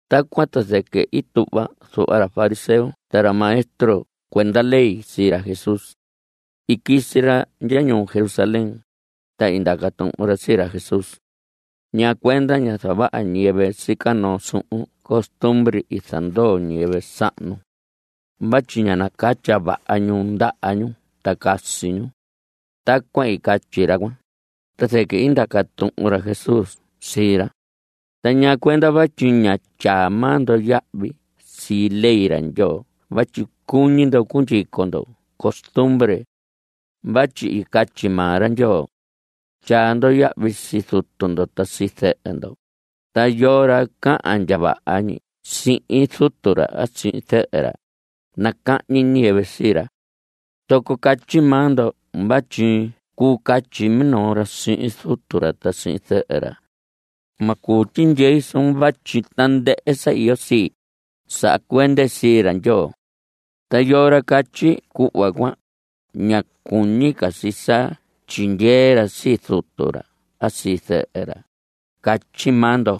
Tacuan ta zɨquɨ i tuhva zuhva ra fariseo ta ra maestro cuenda ley sii ra Jesús. I quisi ra ndya ñuu Jerusalén, ta i ndaca tuhun ra sii ra Jesús: ¿Ñaa cuenda ña zavaha ñiyɨvɨ sica noo suhun costumbre i zandoo ñiyɨvɨ sahnu? Vatyi ña nacatya vaha ñu ndaha ñu ta casi ñu. Tacuan i catyi ra cuan, ta zɨquɨ i ndaca tuhun ra Jesús sii ra: ¿Ta ñaa cuenda vatyi ña tyaa maa ndo yahvi sii ley ra Ndyoo vatyi cuñi ndo cundyico ndo costumbre? Vatyi i catyi maa ra Ndyoo: “Tyaa ndo yahvi sii zutu ndo ta sii zɨhɨ ndo”, ta “Yoo ra cahan ndya vaha ñi sihin zutu ra a sihin zɨhɨ ra, nacahñi ñiyɨvɨ sii ra.” Zoco catyi maa ndo vatyi cuu catyi minoo ra sihin zutu ra a sihin zɨhɨ ra: “Ma cuu tyindyei suun vatyi tandɨhɨ sa iyo sii, saha cuende sii ra Ndyoo.” Ta yoo ra catyi cuhva cuan, ña cuñi ca si sa tyindyee ra sii zutu ra a sii zɨhɨ ra, catyi maa ndo.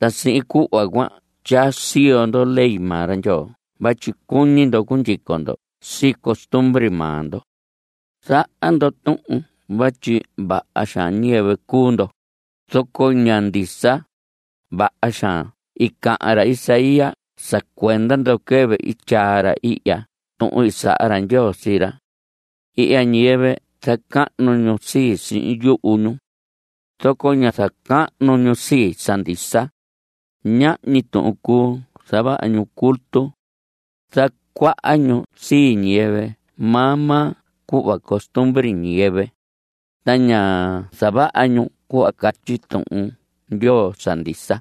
Ta sihin cuhva cuan tyaa siyo ndo ley maa ra Ndyoo vatyi cuñi ndo cundyico ndo sii costumbre maa ndo. ¡Zaha ndo tuhun vatyi vaha xaan ñiyɨvɨ cuu ndo, zoco ña ndisa! Vaha xaan i cahan ra Isaías sa cuenda ndo quɨvɨ i tyaa ra ihya tuhun i saha ra Ndyoo sii ra: Ihya ñiyɨvɨ zacahnu ñu sii, sihin yuhu ñu. Zoco ña zacahnu ñu sii, sa ndisa. Nahñi tuhun cuu sa zavaha ñu culto; Zacuaha ñu sii ñiyɨvɨ maa maa cuhva costumbre ñiyɨvɨ. Ta ña zavaha ñu cuhva catyi Tuhun Ndyoo sa ndisa.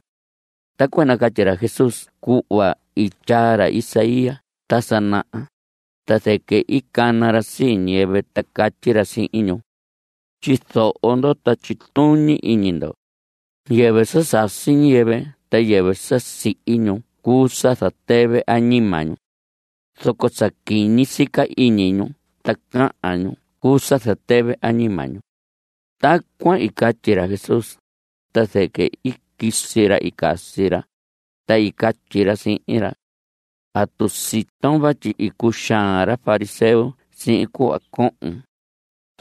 Tacuan i nacatyi ra Jesús cuhva i tyaa ra Isaías ta sa naha, ta zɨquɨ i cana ra sii ñiyɨvɨ, ta catyi ra sihin ñu: Tyizoho ndo, ta tyituñi iñi ndo. Yɨvɨ sa sasi ñiyɨvɨ ta yɨvɨ sa sihi ñu cuu sa zatɨvɨ añima ñu. Zoco sa quiñi sica iñi ñu ta cahan ñu cuu sa zatɨvɨ añima ñu. Tacuan i catyi ra Jesús, ta zɨquɨ i quisi ra i casi ra, ta i catyi ra sihin ra: ¿Atu siton vatyi i cuxaan ra fariseo sihin cuhva cohon?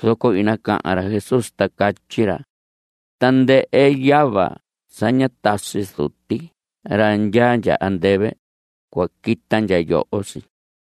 Zoco i nacahan ra Jesús ta catyi ra: Tandɨhɨ yava sa ñá tasi Zuti ra ndyaa andɨvɨ, cua quita ndya yoho si.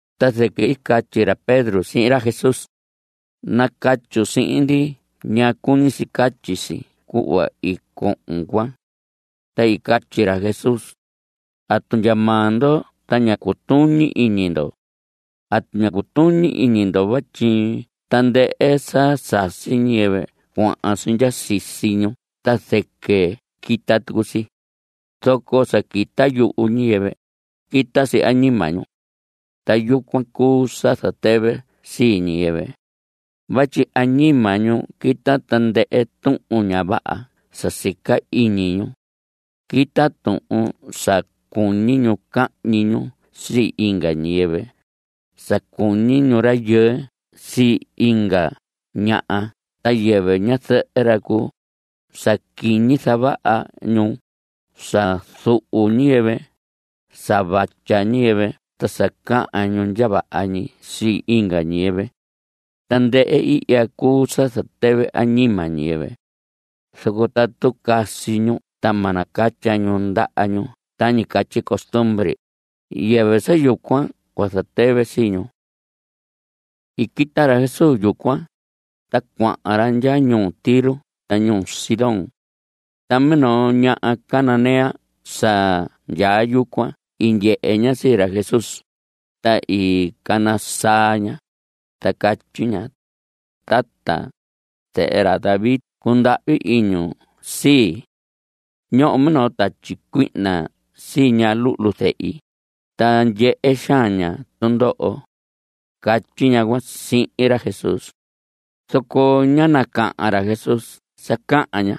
Ta zɨquɨ i catyi ra Pedro sihin ra Jesús: Nacatyun sihin ndi ñaa cuñi si catyi si cuhva i cohon cuan. Ta i catyi ra Jesús: ¿Atu ndya maa ndo ta ña cutuñi iñi ndo? ¿Atu ña cutuñi iñi ndo vatyi tandɨhɨ sa sasi ñiyɨvɨ cuahan si ndya sisi ñu ta zɨquɨ quita tucu si? Zoco sa quita yuhu ñiyɨvɨ, quita si añima ñu. Ta yucuan cuu sa zatɨvɨ sii ñiyɨvɨ. Vatyi añima ñu quita tandɨhɨ tuhun ña vaha sa sica iñi ñu. Quita tuhun sa cuñi ñu cahñi ñu sii inga ñiyɨvɨ, sa cuñi rayɨɨ sii inga ñaha ta yɨvɨ ñazɨhɨ ra cuu, sa quiñi zavaha ñu, sa zuhu ñiyɨvɨ, sa vatya ñiyɨvɨ, ta sa cahan ñu ndya vaha ñi sii inga ñiyɨvɨ. Tandɨhɨ ihya cuu sa zatɨvɨ añima ñiyɨvɨ. Zoco tatu casi ñu ta ma nacatya ñu ndaha ñu tañi catyi costumbre, yɨvɨ sa yucuan cua zatɨvɨ sii ñu. I quita ra Jesús yucuan, ta cuahan ra ndya ñuu Tiro ta ñuu Sidón. Ta minoo ñaha cananea sa ndyaa yucuan i ndyehe ña sii ra Jesús, ta i cana saa ña, ta catyi ña: ¡Tata, zehe ra David, cundahvi iñun sii! Ñoho minoo tatyi cuihna sii ña luhlu zehi, ta ndyehe xaan ña tundoho. Catyi ñaha cuan sihin ra Jesús. Zoco ñá nacahan ra Jesús sa cahan ña.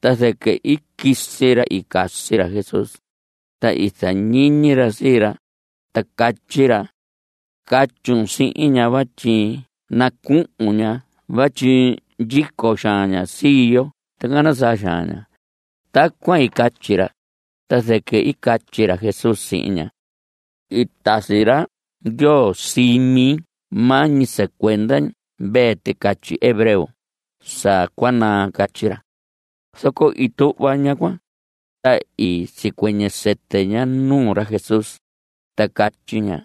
Ta zɨquɨ i quisi ra i casi ra Jesús, ta i zañiñi ra sii ra, ta catyi ra: Catyun sihin ña vatyi nacuhun ña vatyi ndyico xaan ña sii yo ta cana saa xaan ña. Tacuan i catyi ra, ta zɨquɨ i catyi ra Jesús sihin ña: I tasi ra Ndyoo sii mi maa ñi sa cuenda mvee ticatyi hebreo sa cua naa. Catyi ra. Zoco i tuhva ñaha cuan, ta i sicuɨñɨ sɨtɨ ña nuu ra Jesús, ta catyi ña: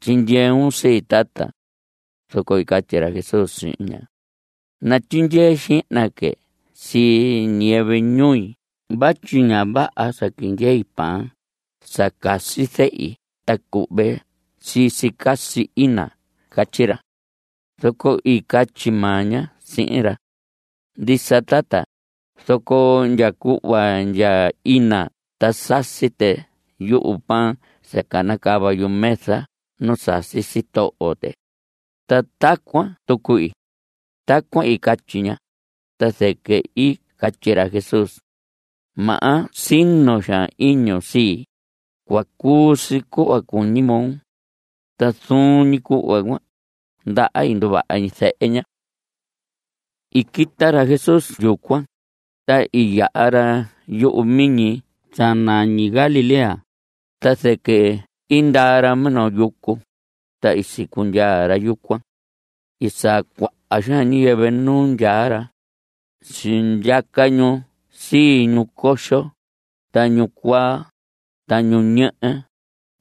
¡Tyindyeun sii, tata! Zoco i catyi ra Jesús sihin ña: Natyindyee xihna que sii ñiyɨvɨ ñui vatyi ña vaha sa quindyei pan sa casi zehi ta cuhve sii si casi ina. Catyi ra. Zoco i catyi maa ña sihin ra: Ndisa, tata; zoco ndya cuhva ndya ina ta sasi tɨ yu pan sa canacava yumesa nu sasi sitoho tɨ. Ta tacuan tucu ii. Tacuan i catyi ña, ta zɨquɨ i catyi ra Jesús: ¡Maha, sino xaan iñun sii! Cua cuu si cuhva cuñi moo. Ta zuun ñi cuhva cuan, ndaha nduvaha ñi zehe ña. I quita ra Jesús yucuan, ta i yaha ra yuhu miñi sa nañi Galilea, ta zɨquɨ i ndaa ra minoo yucu, ta i sicundyaa ra yucuan. I saa cuaha xaan ñiyɨvɨ nu ndyaa ra. Sindyaca ñu sii ñu coxo, ta ñu cuaa, ta ñu ñehe,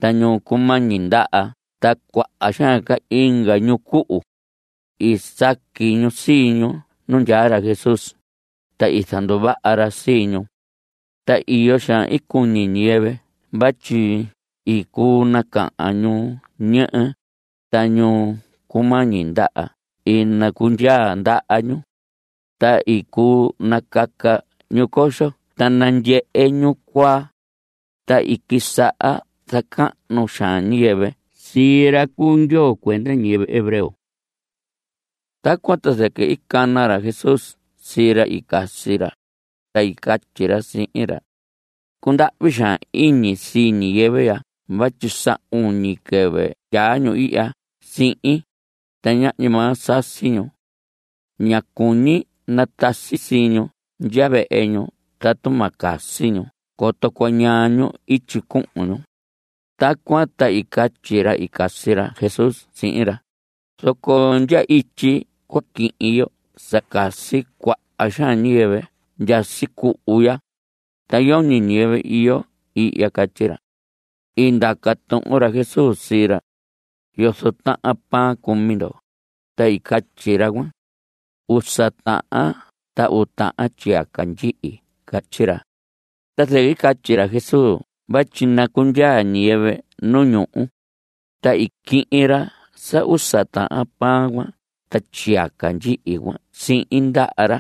ta ñu cumañi ndaha ta cuaha xaan inga ñu cuhu. I saqui ñu sii ñu nu ndyaa ra Jesús, ta i zanduvaha ra sii ñu. Ta iyo xaan i cuñi ñiyɨvɨ vatyi i cuu nacahan ñu ñehe, ta ñu cumañi ndaha i nacundyaa ndaha ñu. Ta i cuu nacaca ñu coxo ta nandyehe ñu cuaa. Ta i quisaha zacahnu xaan ñiyɨvɨ sii ra cu Ndyoo cuenda ñiyɨvɨ hebreo. Tacuan ta zɨquɨ i cana ra Jesús sii ra i casi ra, ta i catyi ra sihin ra: Cundahvi xaan iñi sii ñiyɨvɨ ya vatyi sa uñi quɨvɨ ndyaa ñu ihya sihin, ta ñahñi maa sasi ñu. Ña cuñi natasi sii ñu ndya vehe ñu tatu ma casi ñu coto cuañaa ñu ityi cuhun ñu. Tacuan ta i catyi ra i casi ra Jesús sihin ra: Zoco ¿ndya ityi cua quihin yo sa casi cuaha xaan ñiyɨvɨ ya sicuhu ya? Ta yoñi ñiyɨvɨ iyo ihya. Catyi ra. I ndaca tuhun ra Jesús sii ra: ¿Yozo tahan pan cumi ndo? Ta i catyi ra cuan: Usa tahan ta uu tahan tyiyaca ndyihi. Catyi ra. Ta zɨquɨ i catyi ra Jesús vatyi nacundyaa ñiyɨvɨ nu ñuhu. Ta i quihin ra sa usa tahan pan cuan ta tyiyaca ndyihi cuan sihin ndaha ra,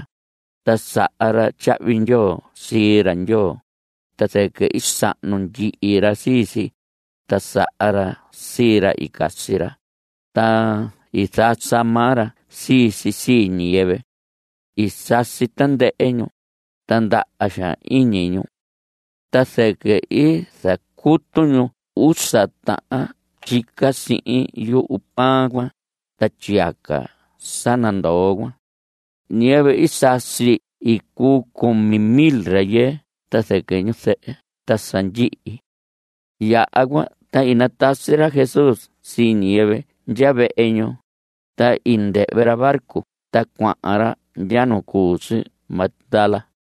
ta saha ra tyahvi ndyoo sii ra Ndyoo. Ta zɨquɨ i sahnu ndyihi ra sii si, ta saha ra sii ra i casi ra, ta i zasa maa ra sii si sii ñiyɨvɨ. I sasi tandɨhɨ ñu, ta ndaha xaan iñi ñu. Ta zɨquɨ i zacutu ñu usa tahan tyica sihin yu pan cuan ta tyiyaca sa nandoo cuan. Ñiyɨvɨ i sasi i cuu cumi mil rayɨɨ ta zɨquɨ ñu zɨhɨ ta sa ndyihi. Yaha cuan ta i natasi ra Jesús sii ñiyɨvɨ ndya vehe ñu, ta i ndɨhvɨ ra barco ta cuahan ra ndya nu cu si Magdala.